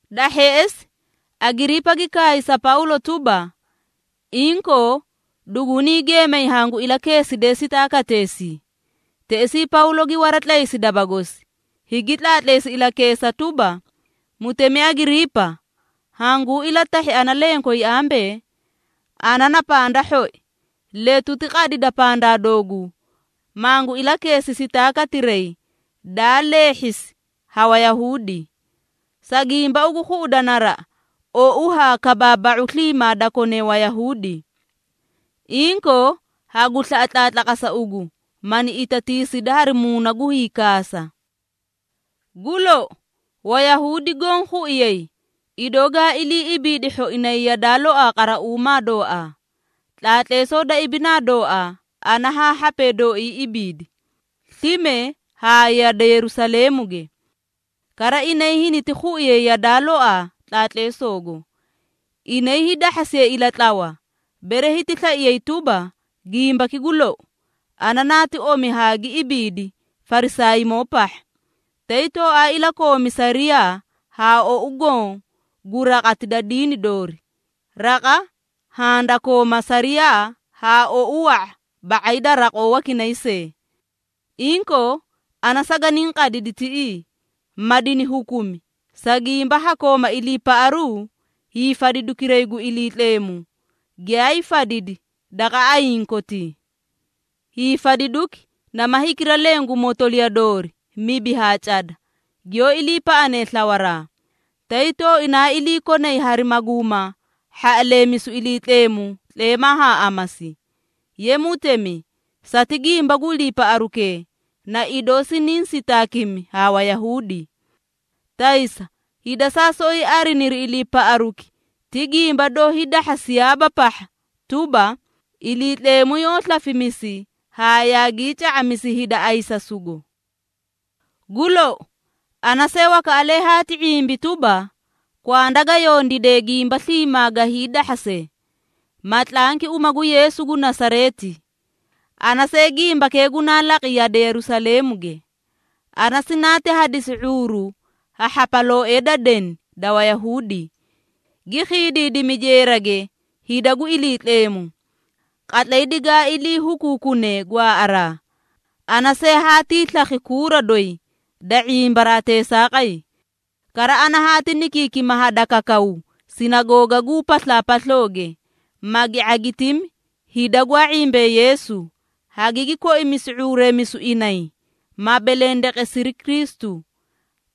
Da hheꞌesi, Agiriipa gi kaay sa Pawlo tuba, “Inkoo, dugunii geemay hangu ilakeeside sitaakateesii.” Teꞌesii Pawlo gi waratlaysi daba gosi, higi tlaatleesi ilakeesa tuba, “Mutemi Agiriipa, hanguu ilatahhi ana lenkoyi ambee, ana na panda hhoi, letuti qadida pandaa dooguu, mangu ilakeesi sitaakatiray daa leehhisi ha Wayahuudi. Sa gimba ugu khuꞌuda naraꞌa ou haa kabaaba⁄u sliimaa da kone Wayahuudi. Inkoo, hagu slaꞌa tlaatlaqasa ugu, mani itatiisidi hari muuna gu hiikaasa. Gu lou, Wayahuudi goõ khuiyay, idoo gaa ilii ibiidi hhoinay yadaa loaa qarauumaa dooaa, tlaatleesoo da ibinaa dooaa ana haa hhapee dooii ibiidi, slime haa yade Yerusaleemuge. Kara inay hiniti khuꞌuyay yadaa looaa tlaatleesoogo. Inay hiidahhasiyay ilatlawa, bere hiti slaiyay tuba, gimbaki gu lou, ana naati omi haa gi ibiidi Farisaaymoo pahha, tay tooaa ilakoomi sariyaa haa ou goõ gu raqati da diini doori, raqa haã da kooma sariyaa haa ou wa⁄a ba⁄ay da raqoo wakinay see. Inkoo, ana saganiĩ qadidi tiꞌii, ma dini hukumi, sa gimba ha kooma iliipaꞌaru hiifadidukiray gu Iliitleemu, giyaay fadidi daqa ayiĩ kotii. Hiifadiduki nama hikira leẽ gu motoliya doori mibi haa cada, giyoó iliipaꞌanee slawaraa, tay tooina iliikonay hari maguuma hhaꞌaleemisu Iliitleemu tleemaa haa amasii. Ye mutemi, sati gimba gu iliipaꞌarukee, na idoo siniĩ sitaakimi ha Wayahuudi! Taysa hida saa soꞌoyi ariniri iliipaꞌaruki ti gimba doó hiidahhasiyaaba pahha tuba, Iliitleemu yoó slafimisi haa yaagii ca⁄amisi hida ayisasugo. Gu lou, ana see wakaꞌalee haati ⁄imbi tuba, kwanda ga yondiide gimba sliimaa ga hiidahhase, ma tlanki uma gu Yeesu gu Nasareeti. Ana see gimbakee gunaa laqi yade Yerusaleemuge. Ana sinaati hadisi ⁄uuru ha hhapalooee da deni da Wayahuudi, gi khiidiidimi jeerage hida gu Iliitleemu. Qatlay digaa ilii hukuukune gwaaꞌaraa, ana see haatii slakhi kuura doyi da ⁄imbaraa teesaaqay. Kara ana haati nikiikima hadakakaw sinagoogaguu paslaapaslooge, magi ⁄agitimi hida gwaa ⁄imbee Yeesu, hagigi koimisi ⁄uureemisu inay, ma belendeqesiri Kristu.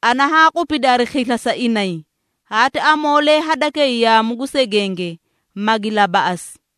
Ana haa qupidi hari khisla sa inay, haati amoolee hadakay yaamu gu segenge, magi labaꞌasi.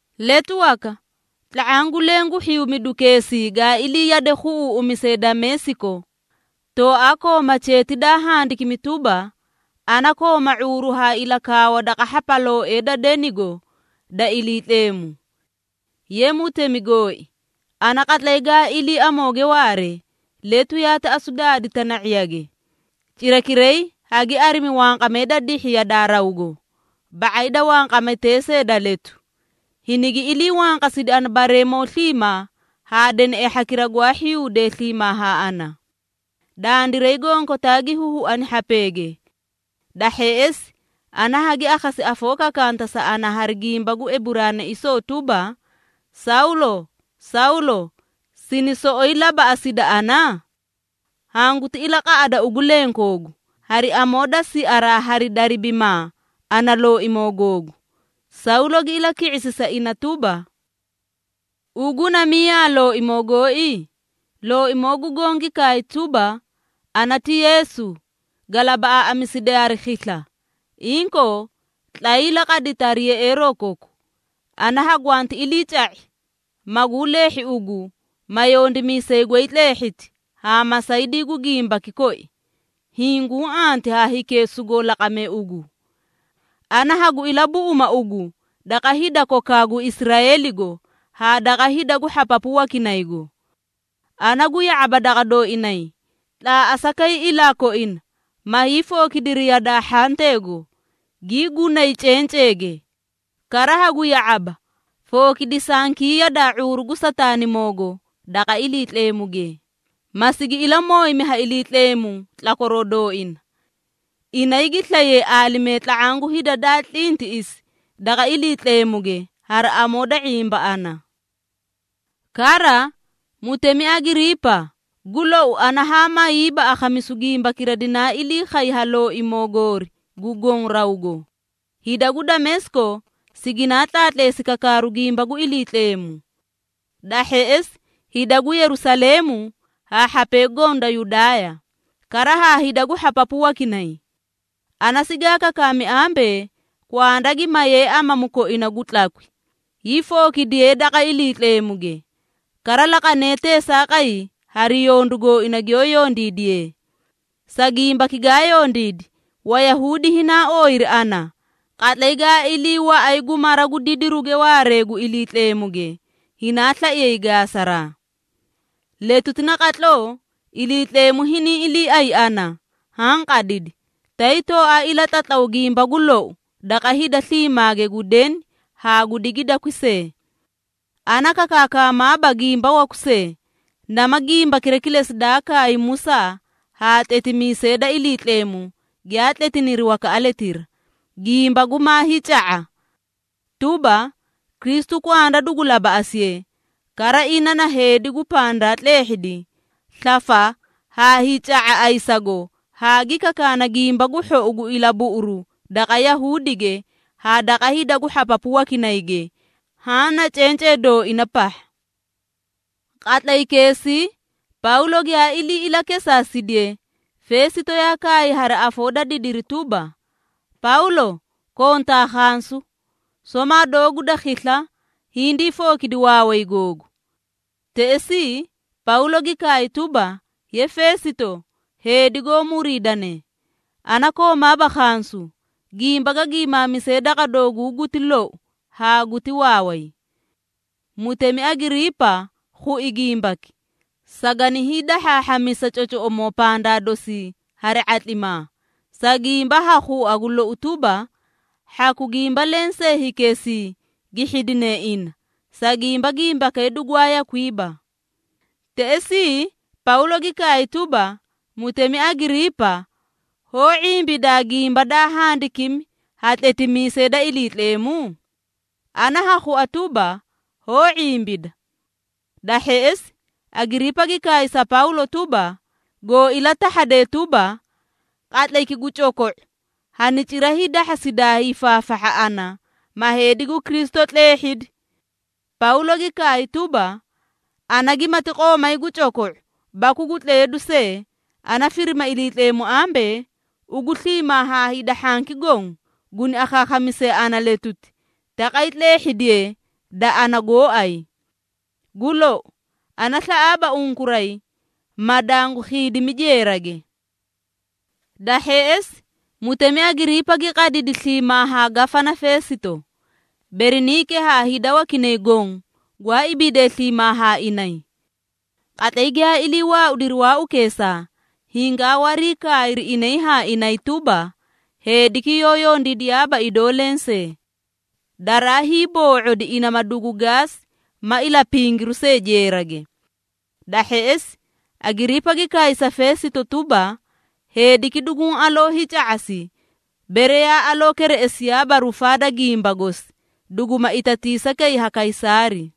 Letu waka, tla⁄aã gu leẽ gu hhiyuumidukeesii gaa ilii yade khuꞌuuꞌumise Dameesiko, tooaa kooma cheeti daa handikimi tuba, ana kooma ⁄uuru haa ilakaawa daqa hhapalooee da denigo da Iliitleemu. Ye mutemi gooi, ana qatlay gaa ilii amooge waare, letu yaati asu daadi tana⁄iyage, cirakiray hagi arimi wanqamee da dihhi yadaa rawgo, ba⁄ay da wanqametee see da letu, hinigi ilii wanqasidi ana bareemoo sliimaa haa deneꞌee hhakira gwaa hhiyuudee sliimaa haa ana. Dandiray gonkotaa gi huhuani hhapeege. Da hheꞌesi, ana hagi akhasi afoo kakanta sa ana hari gimba gu Eburaanaisoo tuba, ‘Sawlo, Sawlo! Sini soꞌoyi labaꞌasida ana? Hanguti ilaqaꞌada ugu lenkoogu, hari amoo da siaraa hari daribimaa ana looimoo googu.’ Sawlo gi ilaki⁄isi sa ina tuba, ‘Ugu na miyaa, Looimoo gooi?’ Looimoo gu Goõ gi kaay tuba, ‘Ana ti Yeesu, ga labaꞌaaꞌamiside hari khisla. Inkoo, tlayii laqadita hari yeꞌeeroo koku. Ana hagwanti iliica⁄i, maguu leehhi ugu, ma yondimiisay goy tleehhiti haa masaydii gu gimbaki koi, hiĩ guũ anti haa hikee sugoo laqame ugu. Ana hagu ilabuꞌuma ugu daqa hida kokaa gu Israeeligo haa daqa hida gu hhapapu wakinaygo. Ana gu ya⁄aba daqa dooinay, tlaaꞌasa kay ilaa koina, maa hiifookidiri yadaa hhanteego, gii gunay cenceege. Kara hagu ya⁄aba, fookidisankii yadaa ⁄uuru gu Sataanimoogo daqa Iliitleemuge, ma sigi ilamooyimi ha Iliitleemu tlakwaroo dooina. Inay gi slayay aalimee tla⁄aã gu hida daa tlintiꞌisi daqa Iliitleemuge hari amoo da ⁄imba ana.’ Kara, mutemi Agiriipa, gu lou ana haa mayiiba akhamisu gimbakira dinaa ilii khay ha Looimoo goori gu goõ rawgo. Hida gu Dameesiko siginaa tlaatleesi kakaaru gimba gu Iliitleemu. Da hheꞌesi hida gu Yerusaleemu haa hhapee goõ da Yudaaya, kara haa hida gu hhapapu wakinay. Ana sigaa kakaami ambee, kwanda gi mayee amamu koina gu tlakwi, hiifookidiyee daqa Iliitleemuge, kara laqanee teesaaqay hari yondu gooina giyoó yondiidiyee. Sa gimbaki gaa yondiidi, Wayahuudi hinaa ooyiri ana, qatlay gaa ilii waꞌay gu mara gu didiruge waaree gu Iliitleemuge, hinaa slaiyay gaasaraa. Letuti naqatloo Iliitleemu hiniĩ iliiay ana, haã qadidi, tay tooaa ilatlatlaw gimba gu lou daqa hida sliimaage gu deni haa gu digidakwi see. Ana kakaakaamaaba gimba waku see, nama gimbakira kilesi daa kaay Musaa haa tletimiisee da Iliitleemu giyaa tletiniri wakaꞌaletira, gimba gumaa hiica⁄a, tuba, Kristu kwanda dugu labaꞌasiye. Kara ina na heedi gu pandaa tleehhidi slafa haa hiica⁄a ayisago haa gi kakaana Gimba gu Hhou gu ilabuꞌuru daqa Yahuudige haa daqa hida gu hhapapu wakinayge, haã na cencee dooina pahha.” Qatlaykeesii, Pawlo giyaa ilii ilakesaasidiye, Feesito yaa kaay hari afoo da didiri tuba, “Pawlo, kontaa khansu! Somaa doogu da khisla, hindii fookidi waaway googu!” Teꞌesii, Pawlo gi kaay tuba, “Ye Feesito heedi goó muriidane, ana koomaaba khansu, gimba ga giimaamise daqa dooguu guti lou haa guti waaway. Mutemi Agiriipa khui gimbaki, sagani hiidahhaahhamisa cocoꞌomoo pandaa dosii hari ⁄atlimaa, sa gimba ha khua gu lou tuba, hhaku gimba lensee hikeesii gi hhidine ina, sa gimba gimbakee dugwaa yakwiiba. Teꞌesii, Pawlo gi kaay tuba, ‘Mutemi Agiriipa, hoó ⁄imbidaa gimba daa handikimi ha tletimiisee da Iliitleemu? Ana ha khua tuba, hoó ⁄imbida.’” Da hheꞌesi, Agiriipa gi kaay sa Pawlo tuba, “Goo ilatahhade tuba, qatlayki gu coko⁄o hani cira hiidahhasidaa hiifaafahha ana, ma heedi gu Kristu tleehhidi!” Pawlo gi kaay tuba, “Ana gimati qoomay gu coko⁄o baku gu tleedu see, ana firima Iliitleemu ambee, ugu sliimaa haa hida hhanki goõ guni akhaakhamisee ana letuti, taqay tleehhidiyee da ana gooay. Gu lou, ana slaꞌaaba unkuray, ma dangu khiidimi jeerage.” Da hheꞌesi, mutemi Agiriipa gi qadidi sliimaa haa Gafana Feesito, Beriniike haa hida wakinay goõ gwaa ibiidee sliimaa haa inay. Qatlay giyaa ilii waaudiri waaukeesaa, hingaa wariikaayri inay haa inay tuba, “Heediki yoó yondiidiyaaba idoo lensee, daraa hiiboo⁄odi ina ma dugu gaasi ma ilapingiru see jeerage.” Da hheꞌesi, Agiriipa gi kaay sa Feesito tuba, “Heediki duguũ aloo hiica⁄asi, bere yaa aloo kereꞌesiyaaba rufaa da gimba gosi, duguma itatiisa kay ha Kaysaari.”